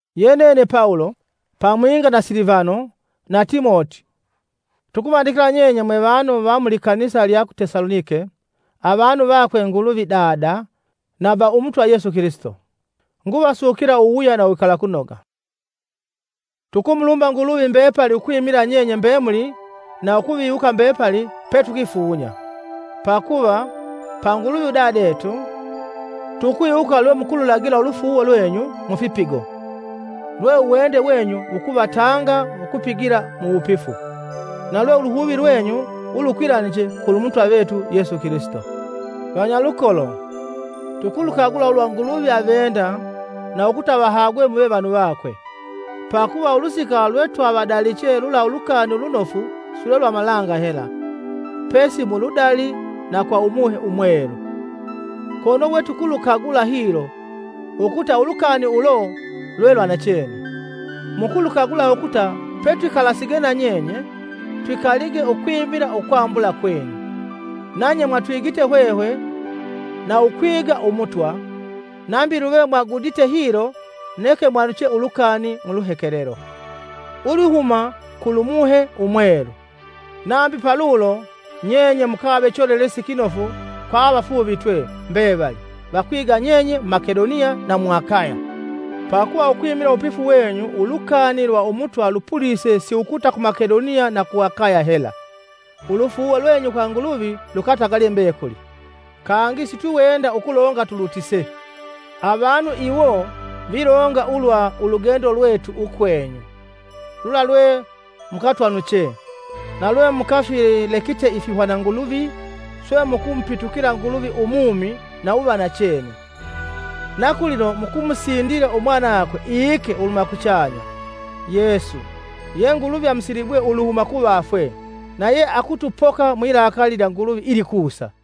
Ye nene Pawulo, pamwinga na Silivano na Timoti tukuvandikila nyenye mwe vanu va mu likanisa lya ku Tesalonike, avanu vakwe Nguluvi Dada, na va Umutwa Yesu Kilisito. Nguvasukila uwuwuya na uwikalakunoga. Tukumulumba Nguluvi mbepali ukwimila nyenye mbemuli na ukuviwuka mbepali petukwifunya. Pakuva, pa Nguluvi udadetu, tukwiwuka lwe mukululagila ulufuuwo lwenyu mufipigo, lwe uwende wenyu wukuvatanga ukupigila muwupifu, na lwe uluhuvi lwenyu ulukwilaniche kulu Mutwa vetu Yesu Kilisito. Vanyalukolo, tukulukagula ulwa Nguluvi avenda na ukuta avahagwe muve vanu vakwe, pakuva ulusika lwe twavadaliche lula Ulukani Ulunofu silwe lwa malanga hela, pesi muludali na kwa Umuhe Umwelu, kono we tukulukagula hilo, ukuta ulukani ulo lwe lwa nachene. Mukulukagula ukuta petwikalasige na nyenye, twikalige ukwimila ukwambula kwenyu. Nanye mwatwigite hwehwe na ukwiga Umutwa; nambi luve mwagudite hilo neke mwanuche ulukani mu luhekelelo ulwihuma kulu Muhe Umwelu. Nambi palulo nyenye mukave mwina valongosi vanofu kwa avafuuvitwe mbevali vakwiga nyenye mu Makedoniya na mu Akaya. Pakuva, ukwimila uwupifu wenyu ulukani lwa Umutwa lupulise si ukuta ku Makedoniya na ku Akaya hela, ulufuuwo lwenyu kwa Nguluvi lukatagalye mbekuli. Kangi sitwiwenda ukulonga tulutise. Avanu iwo vilonga ulwa ulugendo lwetu ukwenyu, lula lwe mukatwanuche, na lwe mukafilekite ifihwana nguluvi swe mukumupitukila Nguluvi u mumi na uva nachene, na kulino mukumusindila umwanakwe iike uluhuma kuchanya, Yesu, ye Nguluvi amusilibwe uluhuma kuvafwe, na ye akutupoka mwilakali lya Nguluvi ilikusa.